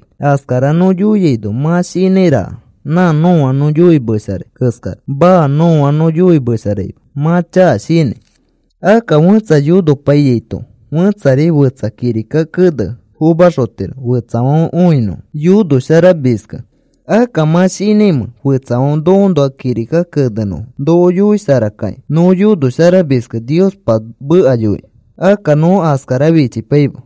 Askara nõ yoiaino, mã shinãiraka nã nõa nõ yoimesharai keskara. Maa. Nõa nõ yoimesharaima. Mã chaka shinãi. Akka fẽtsa yonopaiyaito fẽtsari fetsa kirika kene fomaxotiro fetsafãfe õinõfo yonosharamiskẽ. Akka, ¿mã shinãimẽ fetsafãfe nokoõnoa kirika kenenõfo noko yoisharakakĩ nõ yonosharamiskẽ Niospa meka yoikĩ? Akka nõ askara fichipaima.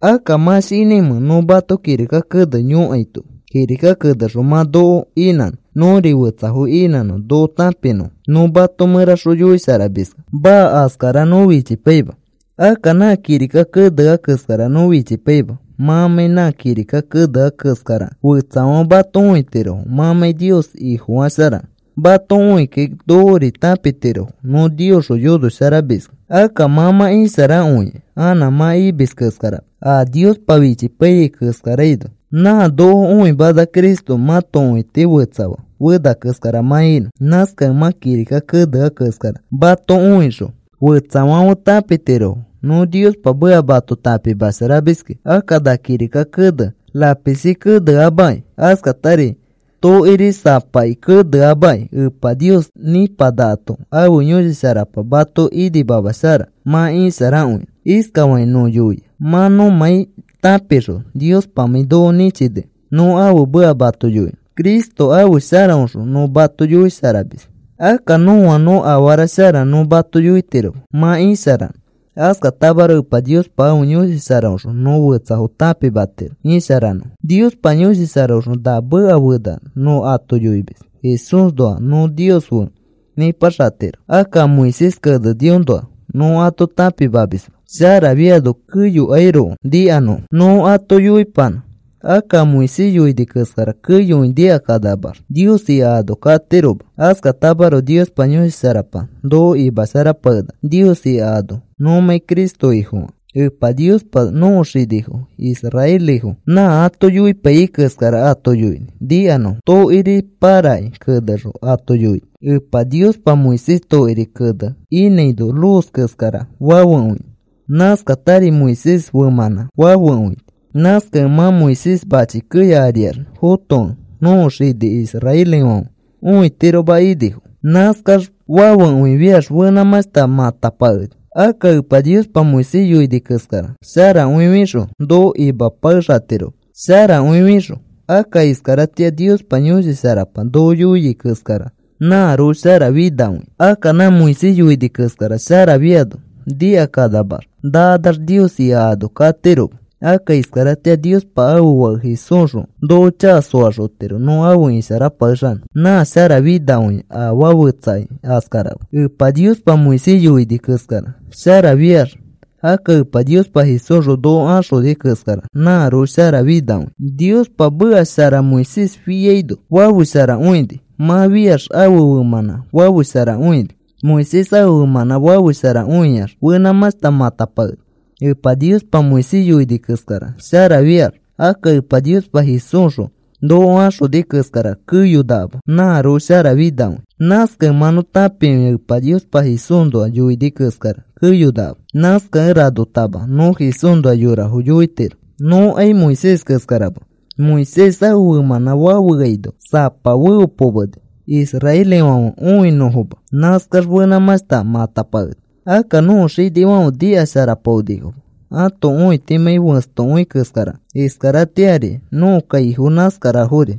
Akka, ¿mã shinãimẽ nõ mato kirika kene yõkaito kirika kenexõ mã noko inãnõ nõri fetsafo inãnõ noko tãpinõfo nõ mato mẽraxõ yoisharamiskẽ? Maa. Askara nõ fichipaima. Akka nã kirika kenea keskara nõ fichipaima mãmãi nã kirika kenea keskarakẽ, fetsafãfe mato õitirofo mãmãi Nios Ifofasharakẽ. Mato õikakĩ nokori tãpitirofo nõ Niosxõ yonosharamiskẽ. Akka mã mã isharakõia anã mã imis keskarama a Niospa fichipaiyai keskaraino. Nã noko õimana Cristo mãto õiti fetsafaa fena keskara mã inõ. Nãskakẽ mã kirika kenea keskara. Mato õixõ fetsafãfe tãpitirofo nõ Niospa meka mato tãpimasharamiskẽ. Akka na kirika kene lapisi kenemeama, askatari tokiri sapaki kenemeama; Epa Nios nĩpanakato ãfe Yõshi Sharapa mato imashara mã isharakõinõ. Iskafakĩ nõ yoia, mã nõmãi tãpixõ Niospamãi noko nĩchinikẽ nõ ãfe meka mato yoinõ Cristo ãfe sharaõxõ nõ mato yoisharamis. Akka nõa nõ afara shara nõ mato yoitiroma mã isharanõ. Askatamaroko Epa Niospa ãfe Yõshi Sharaõxõ nõ fetsafo tãpimatiro isharanõfo. Niospa Yõshi Sharaõxõ na meka fena nõ ato yoimis Jesúsnoa nõ Nios fe nĩpaxatiro. Akka a Moisés keneniõnoa nõ ato tãpimamisma, sharafiano keyokairoko nikanõfo nõ ato yoipanã. Akka a Moisés yoini keskara keyokõi nikakanamax Nios ika ano katiroma. Askatamaroko Niospa Yõshi Sharapa noko imasharapakenaka Nios ika ano nõmãi Cristo Ifofakẽ. Epa Niospa nõko xinifo israelifo nã ato yoipaiyai keskara ato yoini nikanõfo. Tokiri pãraki kenexõ ato yoini. Epa Niospa Moisés tokiri kene inãino luz keskara fafekõini. Nãskatari Moisés femãnã fafekõini. Nãskakẽ mã Moisés mãchi keya ariax fotokẽ nõko xini israelifãfe õitiroma inifo. Nãskax fafekõifiax fenãmãshta matapakeni. Akka Epa Niospa Moisés yoini keskara sharakõifixõ noko imapakexatiroma. Sharakõifixõ, akka iskaratĩa Niospa Yõshi Sharapa noko yoiai keskara nãroko sharafinakõia. Akka nã Moisés yoini keskara sharafiano nikakanamax nakanax Nios ika ano katiroma. Akka iskaratĩa Niospa ãfe Fake Jesúsxõ noko chaka soaxotiro nõ afe isharapakexanõ. Nã sharafinakõia afaa fetsakai askarama. Epa Niospa Moisés yoini keskara sharafiax, akka Epa Niospa Jesúsxõ noko axoni keskara nãroko sharafinakõia. Niospa meka shara Moisés fiaino fafesharakõini. Mã fiax ãfe femãnã fafesharakõini, Moisés. Ãfe femãnã fafesharakõifiax fenãmãshta matapakeni. Epa Niospa Moisés yoini keskara sharafiax, akka Epa Niospa Jesúsxõ noko axoni keskara keyonakama nãroko sharafinakõia. Nãskakẽ mã nõ tãpikõia Epa Niospa Jesúsnoa yoini keskara keyonakama. Nãskakẽ ranotama nõ Jesúsnoa yorafo yoitiro. Nõkai Moisés keskarama. Moisés ãfe femãnã fafeaino samapa feopomeni israelifãfe õinõfoma nãskax fenãmãshta matapakeni. Akka nõko xinifãfe nikasharapaonifoma, ãto õitimãi fẽstokõi keskarakẽ. Iskaratĩari nõko kaifo nãskarafori.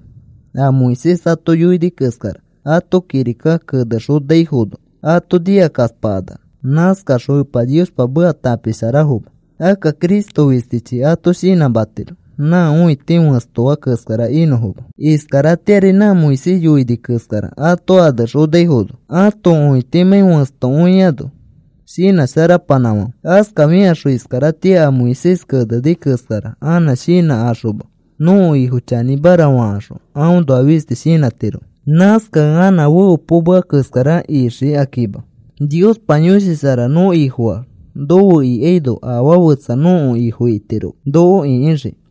A Moisés ato yoini keskara ato kirika anexonaifono ato nikakaspakanax. Nãskakaxõ Epa Niospa meka tãpisharatirofoma. Akka Cristo fistichi ato shinãmatiro nã õiti fẽstoa keskara inõfoma. Iskaratĩari nã Moisés yoini keskara ato anexonaifono ãto õitimãi fẽstokõiano shinãsharapanãfãfe. Askafikaxõ iskaratĩa a Moisés keneni keskara anã shinãkaxoma nõko Ifo chanĩmara fakaxõ aõnoa fisti shinãtirofo. Nãskakẽ anã feopomea keskara ixikakima. Niospa Yõshi Shara nõ Ifofaax nofe ikaino afaa fetsa nõko ifo itiroma, noko ĩkixikĩ.